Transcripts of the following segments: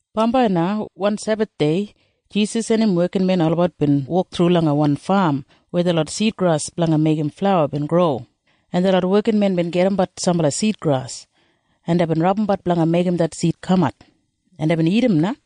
Bambai na wan Sebathdei Jisas en im wekinmen olabat bin wok thru langa wan fam weya detlot sidgras blanga meigim flauwa bin gro, en detlot wekinmen bin gajimbat sambala sidgras, en deibin rabumbat blanga meigim det sid kamat, en deibin dagat na.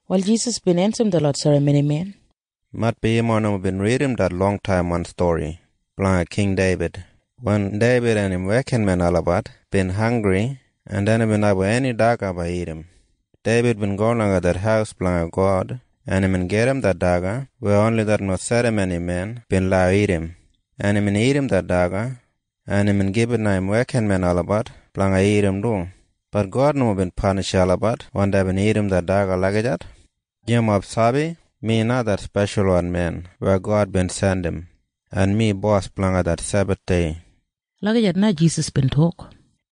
Wal Jisas bin ensim detlot serramonimen, “Maitbi yumob nomo bin ridim det longtaimwan stori blanga King Deibid. Wen Deibid en im wekinmen olabat bin hanggri en dei nomo bin abum eni daga blanga dagat, Deibid bin go langa det haus blanga God, en imbin gajim det daga weya oni detlot serramonimen bin lau dagat, en imbin dagat det daga, en imbin gibit langa im wekinmen olabat blanga dagat du. Bat God nomo bin panishim olabat wen deibin dagat det daga lagijat. “Yumob sabi? Mi na det Speshalwan Men weya God bin jandim, en mi Bos blanga det Sebathdei.” Lagijat na Jisas bin tok.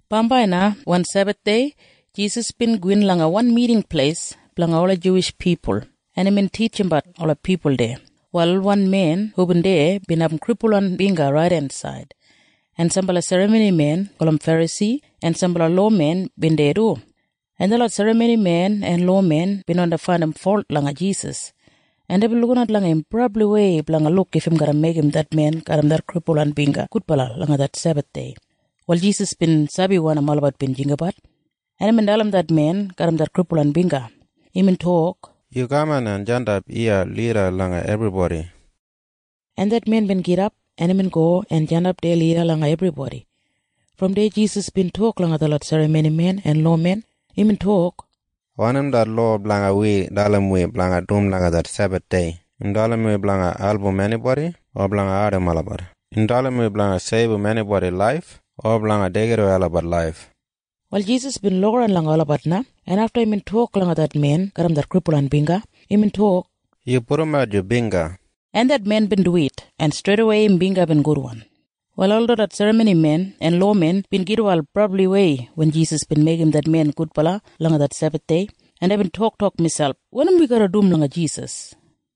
Bambai na wan Sebathdei Jisas bin gowin langa wan Miting Pleis blanga ola Juwish pipul, en imbin titjimbat ola pipul deya. Wal wan men hubin deya bin abum kripulwan bingga raidensaid. En sambala serramonimen gulum Ferasi en sambala lowamen bin deya du, en detlot serramonimen en lowamen bin wandi faindim folt langa Jisas, en deibin lukinat langa im brabliwei blanga luk if im garra meigim det men garram det kripulwan bingga gudbala langa det Sebathdei. Wal Jisas bin sabi wanim olabat bin jinggabat, en imbin dalim det men garram det kripulwan bingga. Imbin tok, “Yu kaman en jandap iya lida langa ebribodi.” En det men bin gidap en imbin go en jandap deya lida langa ebribodi. Brom deya Jisas bin tok langa detlot serramonimen en lowamen. Imbin tok, “Wanim det lowa blanga wi dalim wi blanga dum langa det Sebathdei? Im dalim wi blanga album enibodi o blanga ardim olabat? Im dalim wi blanga seibum enibodi laif o blanga deigidawei olabat laif?” Wal Jisas bin lukaran langa olabat na, en afta imbin tok langa det men garram det kripulwan bingga. Imbin tok, “Yu pudumat yu bingga.” En det men bin duwit, en streidawei im bingga bin gudwan. Wal ol detlot serramonimen en lowamen bin gitwail brabliwei wen Jisas bin meigim det men gudbala langa det Sebathdei, en deibin toktok miselp, “Wanim wi garra dum langa Jisas?”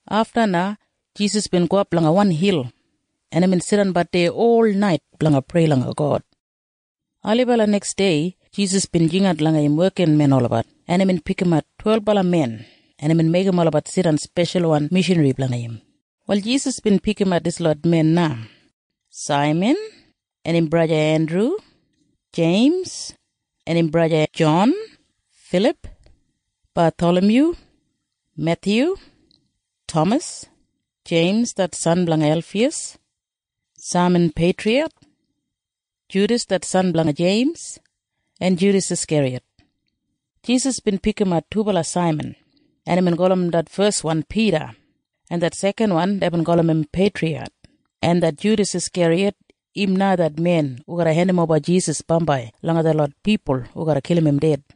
Afta na Jisas bin gowap langa wan hil, en imbin jidanbat deya olnait blanga prei langa God. Ailibala neksdei Jisas bin jingat langa im wekinmen olabat, en imbin pikimat twelbala men, en imbin meigim olabat jidan speshalwan mishanri blanga im. Wal Jisas bin pikimat dislot men na. Saiman en im braja Endru, Jeims en im braja Jon, Filip, Bathalamyu, Methyu, Tamas, Jeims det san blanga Elfiyas, Saiman Peitriyat, Judas det san blanga Jeims, en Judas Askeriyat. Jisas bin pikimat dubala Saiman, en imbin gulum det feswan Pida, en det sekanwan deibin gulum im Peitriyat. En det Judas Askeriyat im na det men hu garra hendimoba Jisas bambai langa detlot pipul hu garra kilim im ded.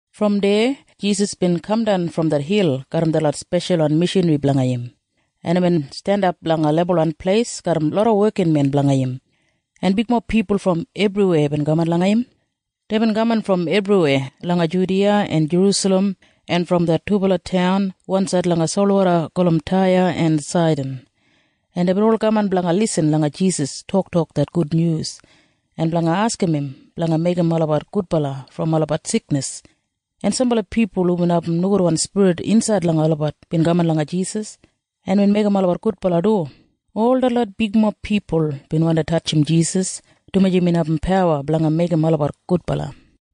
Brom deya Jisas bin kamdan brom det hil garram detlot speshalwan mishanri blanga im, en imbin jandap langa lebulwan pleis garram loda wekinmen blanga im, en bigmob pipul brom ebriweya bin kaman langa im. Deibin kaman brom ebriweya langa Judiya en Jerusalem en brom det dubala taun wansaid langa solwoda gulum Taya en Saidan. En deibin ol kaman blanga irrim Jisas toktok det gudnyus, en blanga askim im blanga meigim olabat gudbala brom olabat siknis. En sambala pipul hubin abum nogudwan spirit insaid langa olabat bin kaman langa Jisas, en imbin meigim olabat gudbala du. Ol detlot pipul na bin wandi tatjim Jisas, dumaji imbin abum pawa blanga meigim olabat gudbala.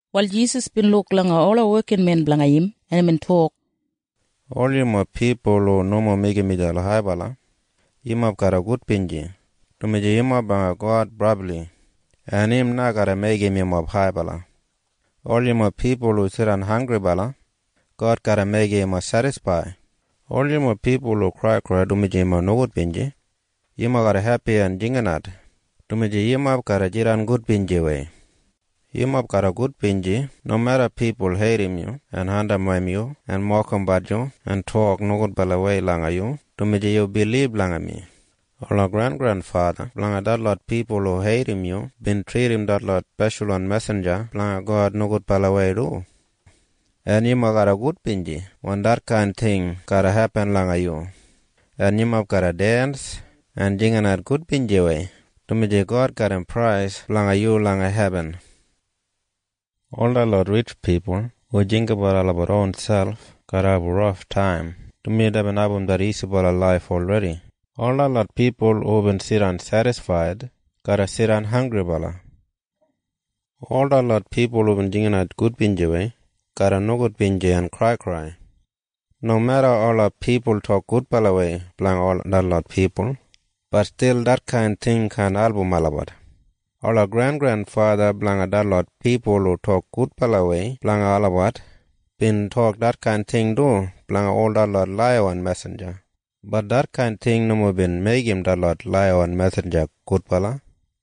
Wal Jisas bin luk langa ola wekinmen blanga im, en imbin tok, “Ol yumob pipul hu nomo meigim miselp haibala, yumob garra gudbinji, dumaji yumob blanga God brabli, en im na garra meigim yumob haibala. “Ol yumob pipul hu jidan hanggribala, God garra meigim yumob sedisfaid. “Ol yumob pipul hu kraikrai dumaji yu nogudbinji, yumob garra hepi en jinginat, dumaji yumob garra jidan gudbinjiwei. “Yumob garra gudbinji nomeda pipul heidim yu en andimwei yu en mokimbat yu en tok nogudbalawei langa yu dumaji yu bilib langa mi. Ola grengrenfatha blanga detlot pipul hu heidim yu bin tridim ol detlot speshalwan mesinja blanga God nogudbalawei du. En yumob garra gudbinji wen detkain ting garra hepin langa yu, en yumob garra dens en jinginat gudbinjiwei, dumaji God garram prais blanga yu langa hebin. “Ol detlot ritj pipul hu jinggabat olabat ronselp garra abum raftaim, dumaji deibin abum det isibala laif olredi. “Ol detlot pipul hubin jidan sedisfaid garra jidan hanggribala. “Ol detlot pipul hubin jinginat gudbinjiwei garra nogudbinji en kraikrai. “Nomeda ola pipul tok gudbalawei blanga detlot pipul, bat stil detkain ting kaan album olabat. Ola grengrenfatha blanga detlot pipul hu tok gudbalawei blanga olabat bin tok detkain ting du blanga ol detlot laiyawan mesinja. Bat detkain ting nomo bin meigim detlot laiyawan mesinja gudbala.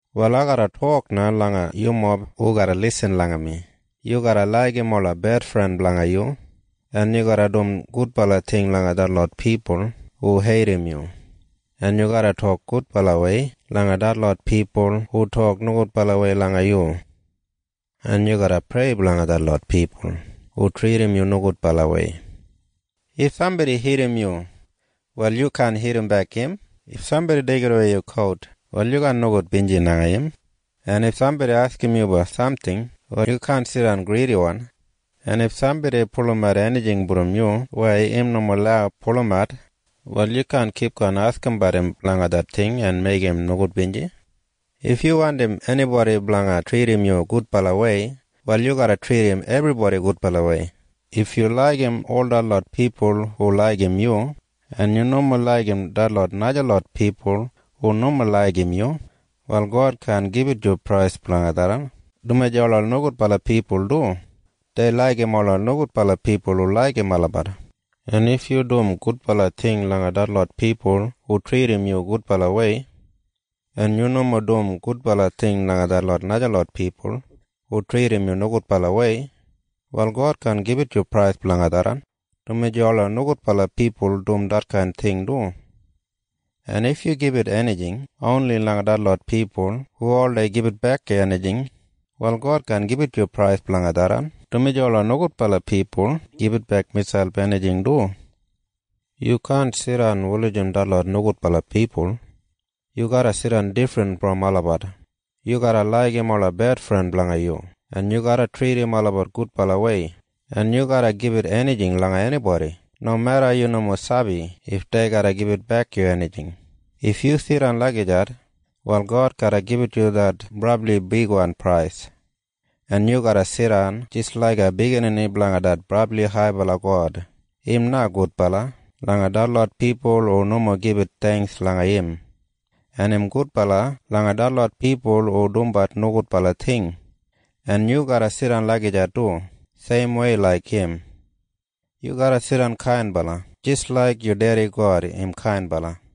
“Wal ai garra tok na langa yumob hu garra lisin langa mi. Yu garra laigim ola bedfren blanga yu, en yu garra dum gudbala ting langa detlot pipul hu heidim yu, en yu garra tok gudbalawei langa detlot pipul hu tok nogudbalawei langa yu, en yu garra prei blanga detlot pipul hu tridim yu nogudbalawei. “If sambodi hitim yu, wal yu kaan hitimbek im. En if sambodi deigidawei yu kout, wal yu kaan nogudbinji langa im. En if sambodi askim yu blanga samting, wal yu kaan jidan gridiwan. En if sambodi pulumat enijing brom yu weya im nomo lau pulumat, wal yu kaan kipgon askimbat im blanga det ting en meigim im nogudbinji. “If yu wandim enibodi blanga tridim yu gudbalawei, wal yu garra tridim ebribodi gudbalawei. “If yu laigim ol detlot pipul hu laigim yu, en yu nomo laigim najalot pipul hu nomo laigim yu, wal God kaan gibit yu prais blanga tharran, dumaji ola nogudbala pipul du dei laigim ola pipul hu laigim olabat. “En if yu dum gudbala ting langa detlot pipul hu tridim yu gudbalawei, en yu nomo dum gudbala ting langa detlot najalot pipul hu tridim yu nogudbalawei, wal God kaan gibit yu prais blanga tharran, dumaji ola nogudbala pipul dum detkain ting du. “En if yu gibit enijing oni langa detlot pipul hu oldei gibitbek yu enijing, wal God kaan gibit yu prais blanga tharran, dumaji ola nogudbala pipul gibitbek miselp enijing du. “Yu kaan jidan wulijim detlot nogudbala pipul. Yu garra jidan difrin brom olabat. Yu garra laigim ola bedfren blanga yu, en yu garra tridim olabat gudbalawei, en yu garra gibit enijing langa enibodi nomeda yu nomo sabi if dei garra gibitbek yu enijing. If yu jidan lagijat, wal God garra gibit yu det brabli bigwan prais, en yu garra jidan jis laiga biginini blanga det brabli haibala God. Im na gudbala langa detlot pipul hu nomo gibit theingks langa im, en im gudbala langa detlot pipul hu dumbat nogudbala ting. En yu garra jidan lagijat du seimwei laik im. Yu garra jidan kainbala jis laik yu Dedi God im kainbala.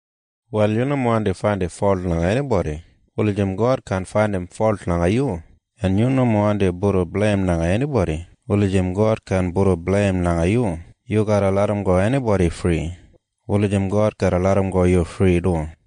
“Wal yu nomo wandi faindim folt langa enibodi wulijim God kaan faindim folt langa yu, en yu nomo wandim pudum bleim langa enibodi wulijim God kaan pudum bleim langa yu. Yu garra larramgo enibodi fri wulijim God garra larramgo yu fri du.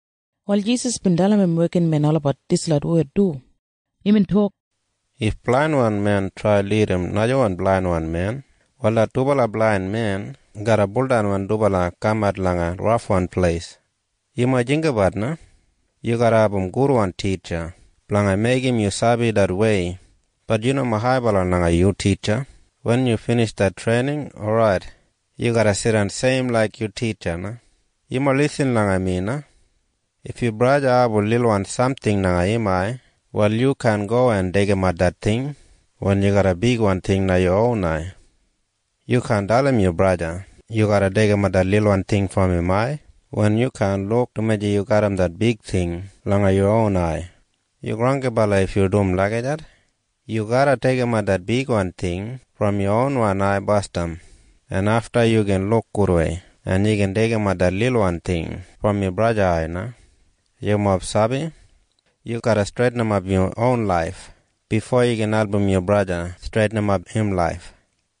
Wal Jisas bin dalim im wekinmen olabat dislot wed du. Imbin tok, “If blainwan men trai en lidim najawan blainwan men, wal det dubala blain men garra buldan wen dubala kamat langa rafwan pleis. “Yumob jinggabat na. Yu garra abum gudwan titja blanga meigim yu sabi det wei. Bat yu nomo haibala langa yu titja. Wen yu binij det treining, orait. Yu garra jidan seim laik yu titja na. “Yumob irrim mi na. If yu braja abum lilwan samting langa im ai, wal yu kaan go en deigimat det ting wen yu garram bigwan ting langa yu ron ai. Yu kaan dalim yu braja yu garra deigimat det lilwan ting brom im ai wen yu kaan luk dumaji yu garram det bigwan ting langa yu ron ai. Yu granggibala if yu trai en dum lagijat. Yu garra deigimat det bigwan ting brom yu ronwan ai basdam, en afta yu gin luk gudwei, en yu gin deigimat det lilwan ting brom yu braja ai na. “Yumob sabi? Yu garra streitinimat yu ronwan laif bifo yu gin album yu braja streitinimat im laif.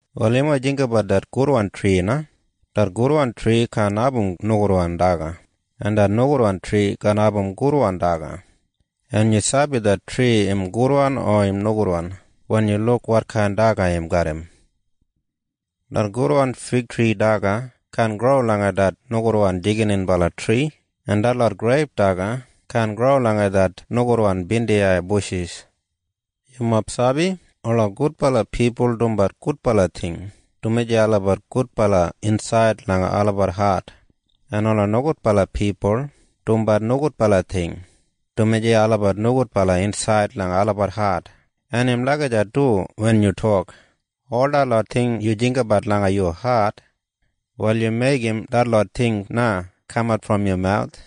“Wal yumob jinggabat det gudwan tri na. Det gudwan tri kaan abum nogudwan daga, en det nogudwan tri kaan abum gudwan daga. En yu sabi det tri im gudwan o nogudwan wen yu luk wotkain daga im garram. Det gudwan figtri daga kaan gro langa det nogudwan jigininbala tri en detlot greip daga kaan gro langa det nogudwan bindiyai bushis. “Yumob sabi? Ola gudbala pipul dumbat gudbala ting, dumaji olabat gudbala insaid langa olabat hat. En ola nogudbala pipul dumbat nogudbala ting, dumaji olabat nogudbala insaid langa olabat hat. En im lagijat du wen yu tok. Ol detlot ting yu jinggabat langa yu hat, wal yu meigim detlot ting na kamat brom yu mawus.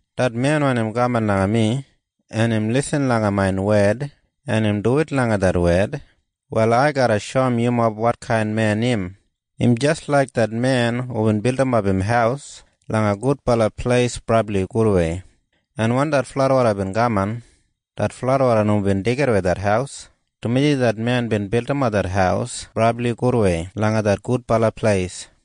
Det men weya im kaman langa mi en im irrim main wed en im duwit langa det wed, wal ai garra shoum yumob wotkain men im. Im jis laik det men hubin bildimap im haus langa gudbala pleis brabli gudwei, en wen det fladwoda bin kaman, det fladwoda nomo bin deigidawei det haus, dumaji det men bin bildimap det haus brabli gudwei langa det gudbala pleis.